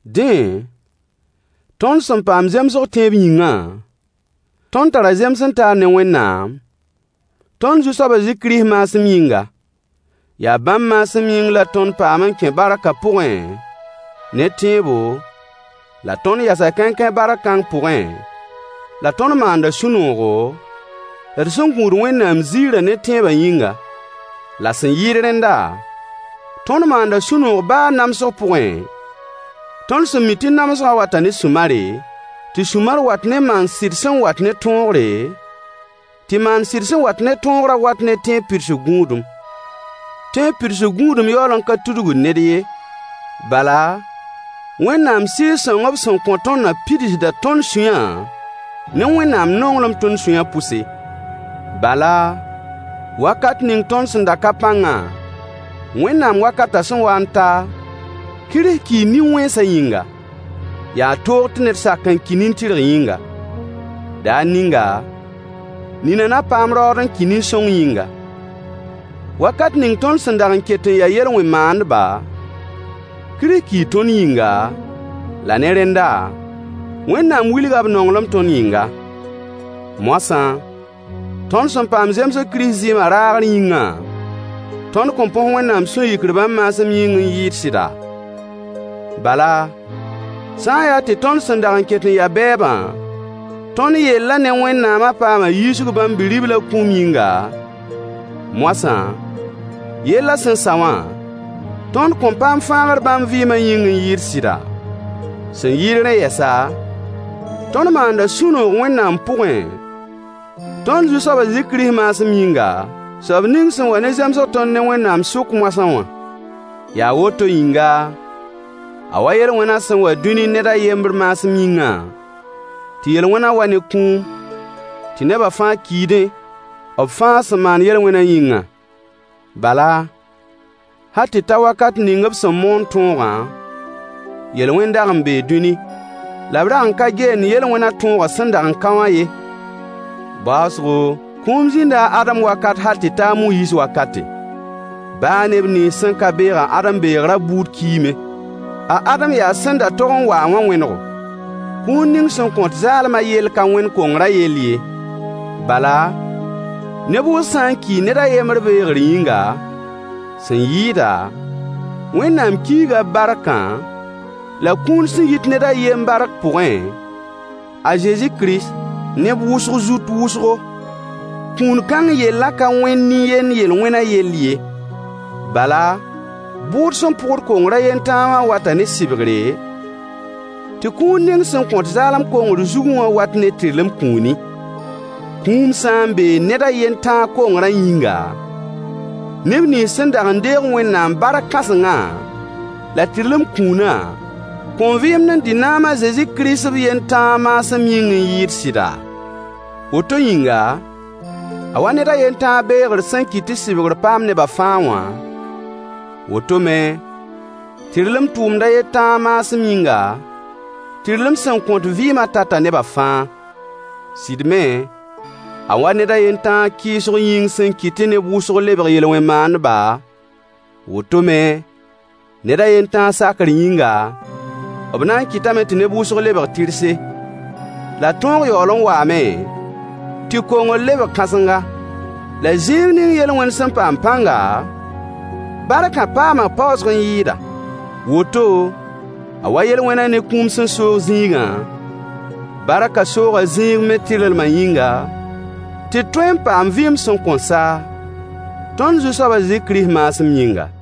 Dẽ, tõnd sẽn paam zemsg tẽeb yĩngã, tõnd tara zems-n-taar ne Wẽnnaam tõnd Zu-soab a Zezi Kirist maasem yĩnga. Yaa bãmb maasem yĩng la tõnd paam n kẽ barkã pʋgẽ ne tẽebo, la tõnd yasa kãenkãe bark kãng pʋgẽ, la tõnd maanda sũ-noogo, d sẽn gũud Wẽnnaam ziirã ne tẽebã yĩngã. La sẽn yɩɩd rẽnda, tõnd maanda sũ-noog baa namsg pugẽ, tõnd sẽn mi tɩ namsgã wata ne sũ-mare, tɩ sũ-mar wat ne maan-sɩd sẽn wat ne tõogre, tɩ maan-sɩd sẽn wat ne tõogrã wat ne tẽeb pidsg gũudum. Tẽeb pidsg gũudum yaool n ka tudgd ned ye, bala, Wẽnnaam Sɩɩg-sõng b sẽn kõ tõndã pidsda tõnd sũyã ne Wẽnnaam nonglem tõnd sũyã pʋse. Bala, wakat ning tõnd sẽn da ka pãngã, Wẽnnaam wakatã sẽn wa n ta, Kirist kii nin-wẽnsã yĩnga. Yaa toog tɩ ned sak n ki nin-tɩrg yĩnga. Daar ninga, nina na paam raood n ki nin-sõng yĩnga. Wakat ning tõnd sẽn dag n ket n ya yel-wẽn maandba, Kirist kii tõnd yĩnga, la ne rẽnda, Wẽnnaam wilga b nonglem tõnd yĩnga. Moasã, tõnd sẽn paam zemsg Kirist zɩɩmã raagr yĩngã, tõnd kõn põs Wẽnnaam sũ-yikr bãmb maasem yĩng n yɩɩd sɩda? Bala, sã n yaa tɩ tõnd sẽn dag n ket n ya bɛɛbã, tõnd yellã ne Wẽnnaamã paama yiisg Bãmb Bi-riblã kũum yĩnga, moasã yellã sẽn sa wã, tõnd kõn paam fãagr bãmb vɩɩmã yĩng n yɩɩd sɩda? Sẽn yɩɩd rẽ yɛsa, tõnd maanda sũ-noog Wẽnnaam pʋgẽ, tõnd Zu-soab a Zezi Kirist maasem yĩnga, soab ning sẽn wa ne zemsg tõnd ne Wẽnnaam sʋk moasã wã. Yaa woto yĩnga, a wa yel-wẽna sẽn wa dũni ned a yembr maasem yĩngã, tɩ yel-wẽnã wa ne kũum, tɩ nebã fãa kiidẽ, b fãa sẽn maan yel-wẽnã yĩngã. Bala, hal tɩ ta wakat ning b sẽn moon tõogã, yel-wẽn dag n bee dũni, la b rag n ka geend yel-wẽnã tõogã sẽn dag n ka wã ye. Baoosgo, kũum zĩnda a Adam wakat hal tɩ ta a Moyiis wakate. Baa neb nins sẽn ka beeg a Adam beegrã buud kiime. A Adam yaa sẽn da tog n wa-a wã wẽnego. Kũun ning sẽn kõt zaalmã yell ka wẽnd kongrã yell ye. Bala, neb wʋsg sã n kii ned a yembr beegr yĩnga, sẽn yɩɩda, Wẽnnaam kiiga b barkã, la kũun sẽn yit ned a yen bark pʋgẽ, a Zezi Kirist, neb wʋsg zut wʋsgo. Kũun-kãng yellã ka wẽnd nin-yend yel-wẽnã yell ye. Bala, bʋʋd sẽn pʋgd kongr a yen tãa wã wata ne sɩbgre, tɩ kũun ning sẽn kõt zaalem kongr zugẽ wã wat ne tɩrlem kũuni. Kũum sã n bee ned a yen tãa kongrã yĩnga, neb nins sẽn dag deeg Wẽnnaam bark-kãsengã la tɩrlem kũunã kõn vɩɩmd n dɩ naam a Zezi Kirist b yen tãa maasem yĩng n yɩɩd sɩda? Woto yĩnga, a wa ned a yen tãa beegr sẽn kɩt tɩ sɩbgr paam nebã fãa wã, woto me, tɩrlem tʋʋmd a yen tãa maasem yĩnga, tɩrlem sẽn kõt vɩɩmã tata neba fãa. Sɩd me, a wa ned a yen tãa kɩɩsg yĩng sẽn kɩt tɩ neb wʋsg lebg yel-wẽn maandba, woto me, ned a yen tãa sakr yĩnga, b na n kɩtame tɩ neb wʋsg lebg tɩrse. La tõog yaool n waame tɩ kongr lebg kãsenga. La zĩig ning yel-wẽn sẽn paam pãnga, barkã paama paoosg n yɩɩda. Woto, a wa yel-wẽnã ne kũum sẽn soog zĩigã, barkã sooga zĩig me tɩrlmã yĩnga, tɩ d tõe n paam vɩɩm sẽn kõn sa, tõnd Zu-soab a Zezi Kirist maasem yĩnga.